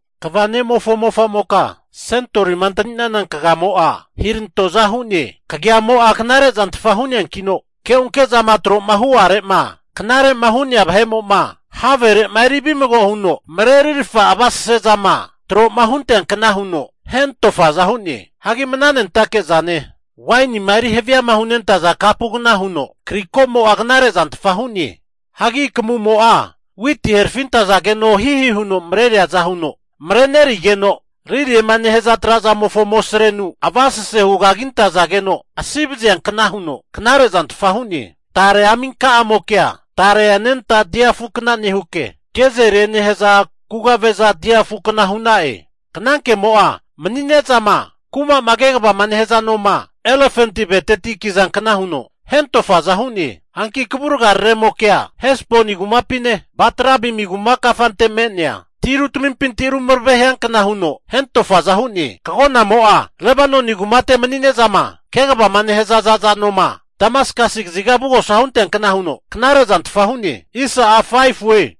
Kva ne'mofo mofamoka kagia noma antaninana kagamo'a hirantoza hu'ne. Kagiamo'a knarezantfa hu'neankino, keonke'zama tro'ma hu'are'ma knare'ma hu'nea vahe'mo'ma havere'ma eri vimago huno marerirafa avasesezama tro hunteankna huno hentofaza hu'ne. Hagi mnanentake zane wainima eri haviama hunentaza kapugna huno kriko'mo'a knare zantfa hu'ne. Hagi kamumo'a witi herafintazageno hihi huno mareriaza huno marerinegeno, liliema nehaza trazamofo amosrenu avasase hugagintazageno asivaziankna huno knare zantfa hu'ne. Tare aminka' amokea tare anenta dia afukna nehuke, gezelie nehaza kugave'za dia afukna hu'na'e. Knankemo'a mani'nezama kuma kegavama nehaza noma elefanti aveteti kinazankna huno hentofaza hu'ne. Hanki kavurga raremokea Hesboni kumapine, Bat-rabimi kuma kafante me'nea tirutamimpinti ru marave hiankna huno hentofaza hu'ne. Kagonamo'a Lebanoni kumate mani'nezama kegavama nehaza za'za nomo'ma Damaskasi kaziga avugosa hunteankna huno knare'zantfa hu'ne.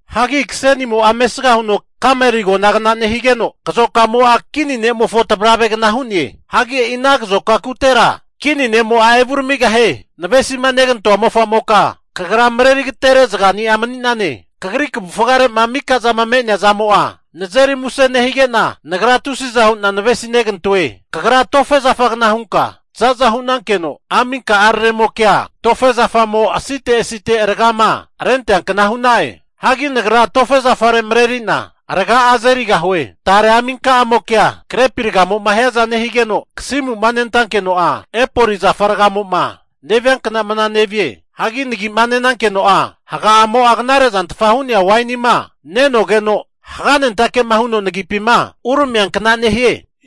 Hagi kasenimo'a mesga huno Kameli agonagna nehigeno, kazokamo'a kini ne'mofo tavravegna hu'ne. Hagi e'i ana kazoka kutera kini ne'mo'a evuramigahie. Navesima negantoa mofamoka kagra marerigatere zagani'a mani'nane. Kagri kavufgare'ma mika zama me'nea zamo'a nazeri muse nehige'na, nagra tusiza hu'na navesinegantoe. Kagra tofe zafagna hunka za'za hu'nankeno, aminka'araremokea tofe zafamo asite asite ragama renteankna hu'na'e. Hagi nagra tofe zafare marerina raga'a azerigahue. Tare aminka'amokea grepi ragamo'ma hiaza nehigeno, kasimu'ma nentakeno'a epoli zafa ragamo'ma neviankna mna nevie. Hagi nagi'ma nenankeno'a, haga'amo'a knare zantfama hu'nea wainima nenogeno, haganentake'ma huno nagipima uramiankna nehie.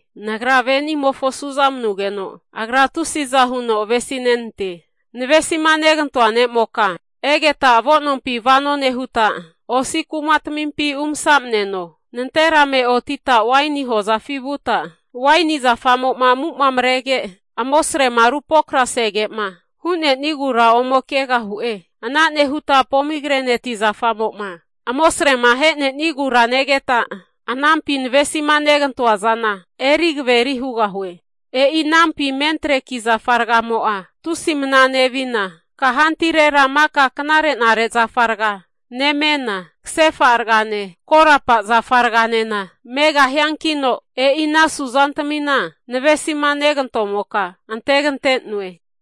Nagra ve'nimofo su'za manugeno, agra tusiza huno avesi nenante. Navesima negantoa ne'moka egeta avo'nompi vano nehuta, osi kumatamimpi umasamneno. Nanterame otita waini hozafi vuta, waini zafamo'ma amuma marege amosrema rupokrasege'ma hu'nenigura ome kegahu'e. Ana nehuta pomigreneti zafamo'ma amosrema ahenenigura negeta, anampi navesima negantoa zana eri kaveri hugahue. E'i anampi mentreki zafa ragamo'a, tusi mna nevina kahantirera maka knare'nare zafa raga nemena, kasefa ragane korapa zafa raganena megahiankino, e'i ana suzantamina navesima negantomoka antegante'noe.